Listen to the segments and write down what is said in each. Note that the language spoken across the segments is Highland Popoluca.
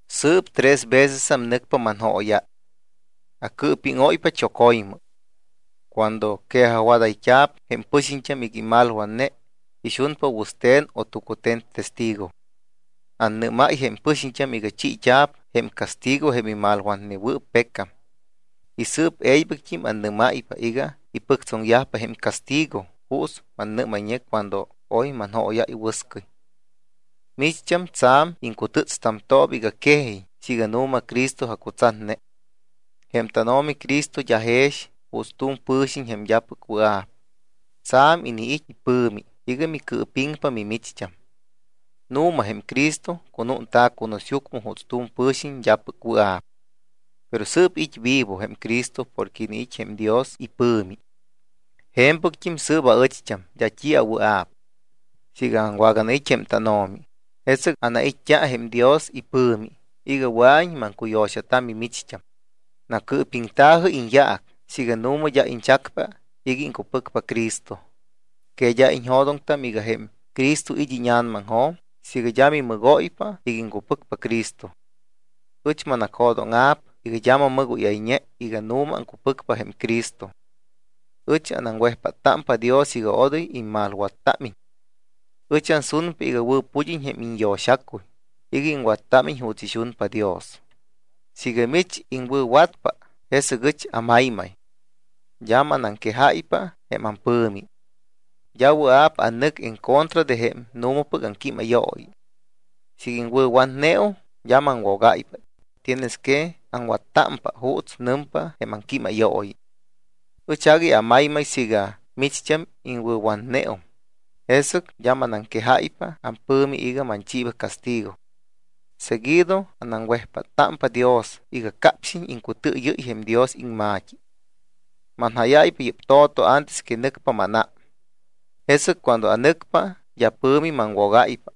Sɨɨp tres vecesam nɨcpa manjóyáy. Acɨɨpíŋóypa choco̱ymɨ. Cuando quejajwadayt́a̱p jém pɨxiñt́am iga imalwatne ixunpa wɨste̱n o tucute̱n testigo. Annɨ́máy jém pɨxiñt́am iga chiit́a̱p jém castigo jém imalwatnewɨɨp pecam. Y sɨɨp e̱ybɨct́im annɨ́máypa iga ipɨctsoŋyajpa jém castigo juuts mannɨ́mayñe cuando oy manjóyáy wɨscɨy. Micht́am tsa̱m aŋcutɨ́tstamtooba iga quejiñ siiga nu̱ma Cristo acutsatne. Jém tánO̱mi Cristo d́a jex juuts tu̱m pɨ̱xiñ jém d́apɨc wɨa̱p. Tsa̱m iniit́ ipɨ̱mi iga micɨɨpiŋpa mimicht́am. Nu̱ma jém Cristo cunúnta̱ cunusyucmɨ juuts tu̱m pɨ̱xiñ d́apɨc wɨa̱p. Pero sɨɨp it́ vivo jém Cristo porque iniit́ jém Dios ipɨ̱mi. Je̱mpɨct́im sɨɨp aɨcht́am d́a t́i awɨa̱p. Siiga aŋwaganait́ jém tánO̱mi, jesɨc anait́t́a jém Dios ipɨ̱mi iga wɨa̱iñ maŋcuyo̱xata mimicht́am. Nacɨɨpiŋta̱jɨ iñyaac siiga nu̱ma d́a iñchacpa iga iŋcupɨcpa Cristo. ¿Que d́a iñjo̱doŋtam iga jém Cristo it́ íña̱namaŋjo̱m siiga d́a mimɨgóypa iga iŋcupɨcpa Cristo? Ɨch manacjo̱dóŋa̱p iga d́a mammɨgóyayñe iga nu̱ma aŋcupɨcpa jém Cristo. Ɨch anaŋwejpáttámpa Dios iga odoy immalwattámiñ. Ɨch ansunpa iga wɨ̱pud́iñ jém iñyo̱xacuy iga iŋwattámiñ juuts ixunpa Dios. Siiga mich iŋwɨ̱watpa, jesɨc ɨch amaymay. D́a manaŋquejáypa jém ampɨ̱mi. D́a wɨa̱p anɨc en contra de jém nu̱mapɨc aŋquímayooyi. Siiga iŋwɨ̱watneum, d́a maŋwogáypa. Tienes que aŋwattámpa juuts nɨmpa jém aŋquímayooyi. Ɨch agui amaymay siiga micht́am iŋwɨ̱watneum, jesɨc d́a manaŋquejáypa ampɨ̱mi iga manchiiba castigo. Seguido anaŋwejpáttámpa Dios iga capxiñ iŋcutɨɨyɨ́y jém Dios iŋma̱t́i. Manjáyáypa yɨ́p to̱to antes que nɨcpa mánám. Jesɨc cuando anɨcpa, d́a pɨ̱mi maŋwogáypa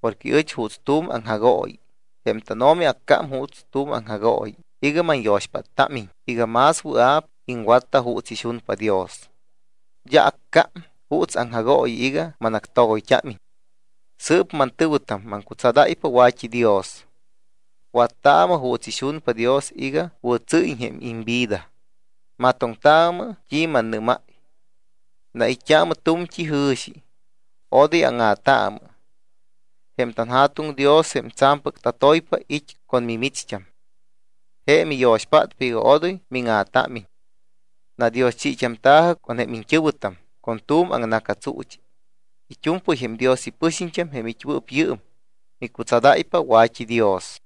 porque ɨch juuts tu̱m aŋjagooyi. Jém tánO̱mi accám juuts tu̱m aŋjagooyi iga manyo̱xpáttámiñ iga más wɨa̱p iŋwatta juuts ixunpa Dios. D́a accám juuts aŋjagooyi iga manactogoyt́ámiñ. Sɨɨp mantɨ̱wɨtam, maŋcutsadáypa wa̱t́idios. Wattaamɨ juuts ixunpa Dios iga wɨ̱tsɨ́yiñ jém imvida. Matoŋtaamɨ t́i mannɨ́máy. Nait́t́aamɨ tu̱mt́i jɨ̱xi. Odoy áŋa̱taamɨ. Jém tanJa̱tuŋ Dios, jém tsa̱mpɨc tatoypa, it́ con mimicht́am. Je miyo̱xpátpa iga odoy míŋa̱támiñ. Nadioschit́amta̱jɨ con jém iñt́ɨ̱wɨtam con tu̱m aŋna̱catsuuchi. It́u̱mpɨy jém Dios ipɨxiñt́am, jém it́wɨɨp yɨɨm, micutsadáypa wa̱t́idios.